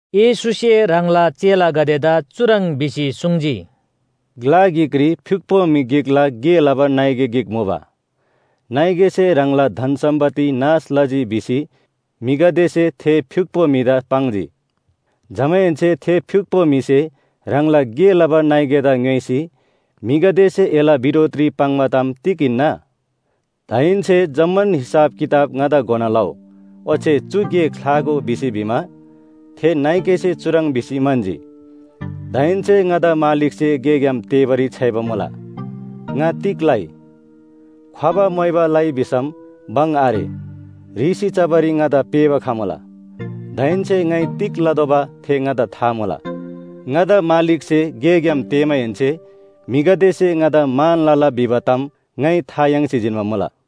येशूसे ह्राङला चेलागदेदा चुह्रङ् भिसी सुङ्जी, “ग्‍ला गिकरी फ्‍युक्‍पो म्‍हि गिकला गे लबा नाइके गिक मुबा। ‘नाइकेसे ह्राङला धन सम्‍पत्ति नाश लजी’ भिसी म्‍हिगदेसे थे फ्‍युक्‍पो म्‍हिदा पाङ्जी। जमाहेन्‍से थे फ्‍युक्‍पो म्‍हिसे ह्राङला गे लबा नाइकेदा ङ्‌योइसी ‘म्‍हिगदेसे एला बिरोधरी पाङ्बा ताम तिग हिन्‍ना? दाहेन्‍से जम्‍मान हिसाब किताब ङादा घोना लउ। ओच्‍छे चु गे ख्‍लागो’ भिसी भिमा, थे नाइकेसे चुह्रङ् भिसी म्‍हन्‍जी, ‘दाहेन्‍से ङादा मालिकसे गेग्‍याम तेःबारी छ्‌याइबा मुला, ङा तिग लइ? ख्‍वबा मोइबा लइ भिसम भङ आरे, ह्रीसी चबारी ङादा पेःबा खमुला। दाहेन्‍से ङाइ तिग लतोःबा थे ङादा था मुला, ङादा मालिकसे गेग्‍याम तेःमाहेन्‍से म्‍हिगदेसे ङादा मान लला भिबा ताम ङाइ था याङ्सी जिन्‍बा मुला।’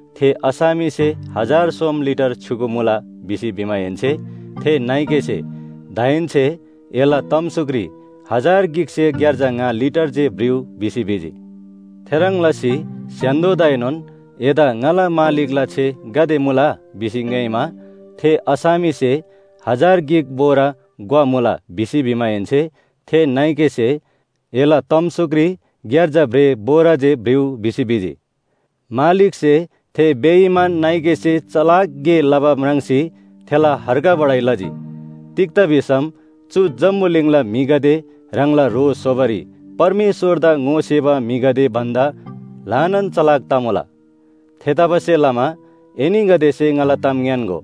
थे असामीसे ‘हजार सोम लिटर छ्‌युगु मुला’ भिसी भिमाहेन्‍से थे नाइकेसे ‘दाहेन्‍से एला तमसुकरी हजार गिकसे ग्‍यार्जा ङा लिटर जे भ्रिउ’ भिसी भिजी। थेह्रङ् लसी स्‍य्‍हान्‍दोदाएनोन ‘एदा ङाला मालिकला छे गाते मुला?’ भिसी ङ्‌योइमा, थे असामीसे ‘हजार गिक बोरा ग्‍वा मुला’ भिसी भिमाहेन्‍से थे नाइकेसे ‘एला तमसुकरी ग्‍यार्जा भ्रेः बोरा जे भ्रिउ’ भिसी भिजी। “मालिकसे थे बेइमान नाइकेसे चलाक गे लबा म्राङ्सी थेला हर्गबढाइ लजी। तिग्‍दा भिसम चु जम्‍बुलिङला म्‍हिगदे ह्राङला ह्रो स्‍होबारी परमेश्‍वरदा ङोसेबा म्‍हिगदे भन्‍दा ल्‍हानान चलाक तमुला। थेतबासेलमा एनीगदेसे ङाला ताम ङ्‌यान्‍गो,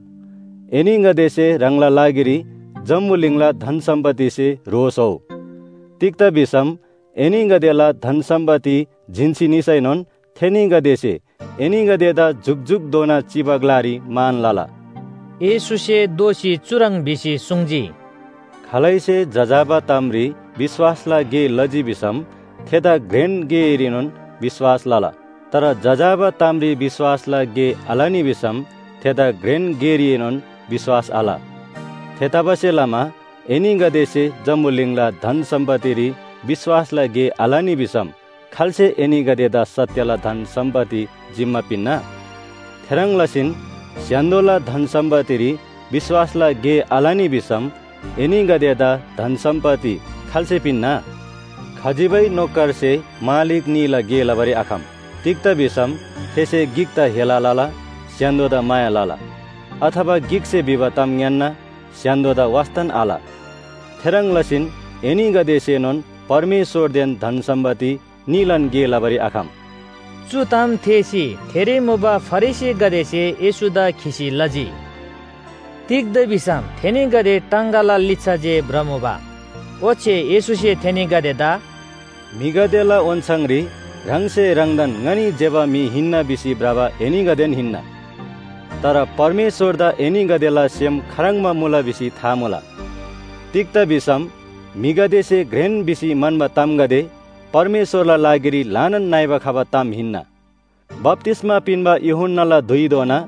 एनीगदेसे ह्राङला लागिरी जम्‍बुलिङला धन सम्‍पत्तिसे ह्रो स्‍होउ। तिग्‍दा भिसम एनीगदेला धन सम्‍पत्ति जिन्‍सी निसैनोन थेनीगदेसे एनीगदेदा जुकजुकधोना चिबा ग्‍लारी मान लला। येशूसे दोःसी चुह्रङ् भिसी सुङ्जी, “खालैसे जजाबा तामरी विश्‍वासला गे लजी भिसम थेदा घ्रेन गेरीएनोन विश्‍वास लला। तर जजाबा तामरी विश्‍वासला गे आलनी भिसम थेदा घ्रेन गेरीएनोन विश्‍वास आल। थेतबासेलमा एनीगदेसे जम्‍बुलिङला धन सम्‍पत्तिरी विश्‍वासला गे आलनी भिसम खाल्‍से एनीगदेदा सत्‍यला धन सम्‍पत्ति जिम्‍मा पिन्‍ना? थेह्रङ् लसीन स्‍य्‍हान्‍दोला धन सम्‍पत्तिरी विश्‍वासला गे आलनी भिसम एनीगदेदा धन सम्‍पत्ति खाल्‍से पिन्‍ना? “खजिबै नोकरसे मालिक न्‍हीला गे लबारी आखम। तिग्‍दा भिसम थेसे गिकदा हेला लला, स्‍य्‍हान्‍दोदा माया लला, अथवा गिकसे भिबा ताम ङ्‌यान्‍ना, स्‍य्‍हान्‍दोदा वास्‍तान आल। थेह्रङ् लसीन एनीगदेसेनोन परमेश्‍वरदेन धन सम्‍पत्ति न्‍हीलान गे लबारी आखम।” चु ताम थेःसी थेरी मुबा फरिसीगदेसे येशूदा खिसी लजी। तिग्‍दा भिसम थेनीगदे टाङगाला लिच्‍छा जे भ्रमुबा। ओच्‍छे येशूसे थेनीगदेदा “म्‍हिगदेला ओन्‍छाङरी ह्राङसे ह्राङदान ङनी ज्‍यबा म्‍हि हिन्‍ना भिसी भ्रबा एनीगदेन हिन्‍ना। तर परमेश्‍वरदा एनीगदेला सेम खाह्रङ्बा मुला भिसी था मुला। तिग्‍दा भिसम म्‍हिगदेसे घ्रेन भिसी म्‍हन्‍बा तामगदे परमेश्‍वरला लागिरी ल्‍हानान नइबा खबा ताम हिन्‍ना। “बप्‍तिस्‍मा पिन्‍बा यूहन्‍नाला धुइधोना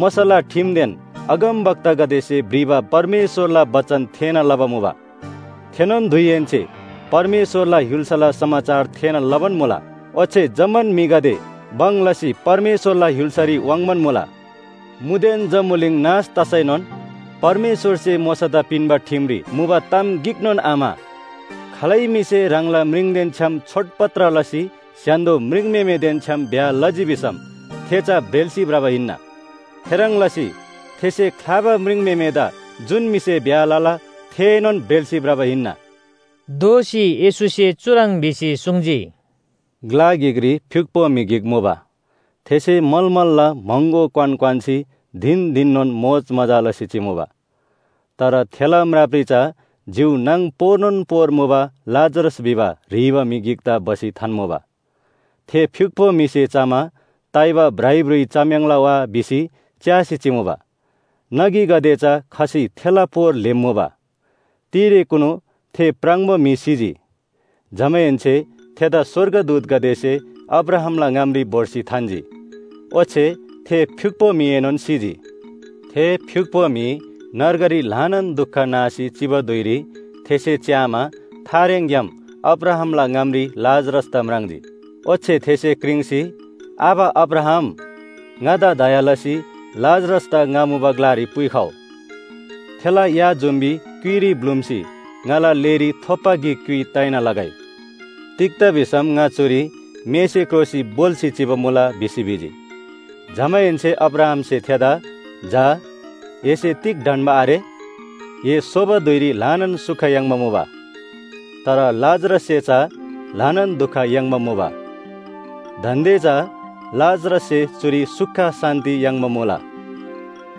मोशाला ठिमदेन अगमवक्तागदेसे भ्रिबा परमेश्‍वरला बचन थेःना लबा मुबा। थेनोन धुइहेन्‍से परमेश्‍वरला य्‍हुल्‍साला समाचार थेःना लबान मुला। ओच्‍छे जम्‍मान म्‍हिगदे भङ लसी परमेश्‍वरला य्‍हुल्‍सारी वाङ्बान मुला। मुदेन जम्‍बुलिङ नाश तसैनोन परमेश्‍वरसे मोशादा पिन्‍बा ठिमरी मुबा ताम गिकनोन आम्‍हा। “खालै म्‍हिसे ह्राङला म्रिङदेन छ्‌याम छोडपत्र लसी स्‍य्‍हान्‍दो म्रिङम्‍हेमेदेन छ्‌याम ब्‍याह लजी भिसम थे चा ब्रेल्‍सी भ्रबा हिन्‍ना। थेह्रङ् लसी थेसे ख्‍लाबा म्रिङम्‍हेमेदा जुन म्‍हिसे ब्‍याह लला थेएनोन ब्रेल्‍सी भ्रबा हिन्‍ना।” दोःसी येशूसे चुह्रङ् भिसी सुङ्जी, “ग्‍ला गिकरी फ्‍युक्‍पो म्‍हि गिक मुबा। थेसे मलमलला महँगो क्‍वान क्‍वान्‍सी धिन धिननोन मोजमजा लसी चिमुबा। तर थेला म्रापरी चा जिउ नाङ पोरनोन पोर मुबा लाजरस भिबा ह्रीबा म्‍हि गिकदा भसी थान्‍मुबा। थे फ्‍युक्‍पो म्‍हिसे चमा ताइबा भ्राइभ्रुइ चम्‍याङ्ला वा भिसी च्‍यासी चिमुबा। नगीगदे चा खसी थेला पोर ल्‍हेम्‍मुबा। “तिरेकुनु थे प्राङबो म्‍हि सिजी। जमाहेन्‍से थेदा स्‍वर्गदूतगदेसे अब्राहामला ङामरी भोर्सी थान्‍जी। ओच्‍छे थे फ्‍युक्‍पो म्‍हिएनोन सिजी। थे फ्‍युक्‍पो म्‍हि नर्गरी ल्‍हानान दुख नासी चिबा धुइरी थेसे च्‍यामा थारेङग्‍याम अब्राहामला ङामरी लाजरसदा म्राङ्जी। ओच्‍छे थेसे क्रिङ्सी ‘आबा अब्राहाम, ङादा दया लसी लाजरसदा ङा मुबा ग्‍लारी पुइखउ। थेला या जुम्‍बी क्‍युइरी ब्‍लुम्‍सी ङाला लेरी थोपा गिक क्‍युइ ताइना लगै। तिग्‍दा भिसम ङा चुरी मेसे क्रोसी भोल्‍सी चिबा मुला’ भिसी भिजी। “जमाहेन्‍से अब्राहामसे थेदा ‘झा, एसे तिग ढन्‍बा आरे? ए सोबा धुइरी ल्‍हानान सुख याङ्बा मुबा, तर लाजरससे चा ल्‍हानान दुख याङ्बा मुबा। दान्‍दे चा लाजरससे चुरी सुख शान्‍ति याङ्बा मुला,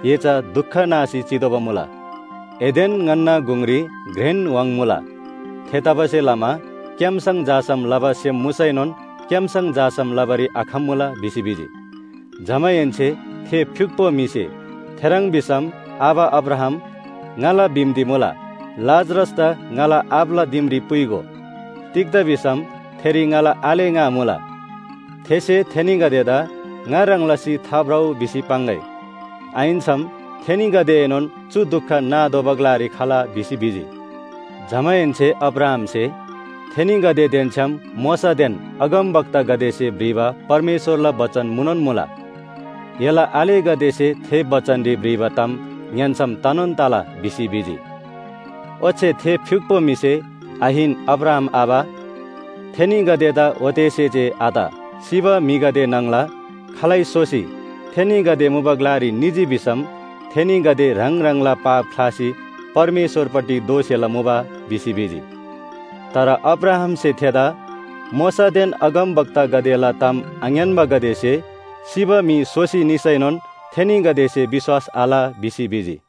एसे चा दुख नासी चितोःबा मुला। एदेन छ्‌याम ङन्‍ना गुङरी घ्रेन व्‍हाङ मुला। थेतबासेलमा क्‍याम्‍सङ झासम लबा सेम मुसैनोन क्‍याम्‍सङ झासम लबारी आखम्‍मुला’ भिसी भिजी। “जमाहेन्‍से थे फ्‍युक्‍पो म्‍हिसे ‘थेह्रङ् भिसम आबा अब्राहाम, ङाला बिन्‍ती मुला, लाजरसदा ङाला आबाला दिमरी पुइगो। तिग्‍दा भिसम थेरी ङाला आले ङा मुला। थेसे थेनीगदेदा ङा ह्रङ् लसी थाभ्रउ भिसी पाङ्‌गै, आहिन्‍सम थेनीगदेएनोन चु दुख नातोःबा ग्‍लारी खला’ भिसी भिजी। “जमाहेन्‍से अब्राहामसे, ‘थेनीगदेदेन छ्‌याम मोशादेन अगमवक्तागदेसे भ्रिबा परमेश्‍वरला बचन मुनोन मुला, एला आलेगदेसे थे बचनरी भ्रिबा ताम ङ्‌यान्‍सम तनोन तला’ भिसी भिजी। “ओच्‍छे थे फ्‍युक्‍पो म्‍हिसे ‘आहिन अब्राहाम आबा, थेनीगदेदा ओतेसे जे आत। सिबा म्‍हिगदे न्‍हङला खालै सोसी थेनीगदे मुबा ग्‍लारी निजी भिसम थेनीगदे ह्राङ ह्राङला पाप ख्‍लासी परमेश्‍वरपट्टि दोःसेला मुबा’ भिसी भिजी। “तर अब्राहामसे थेदा ‘मोशादेन अगमवक्तागदेला ताम आङ्‌यान्‍बागदेसे सिबा म्‍हि सोसी निसैनोन थेनीगदेसे विश्‍वास आल’ भिसी भिजी।”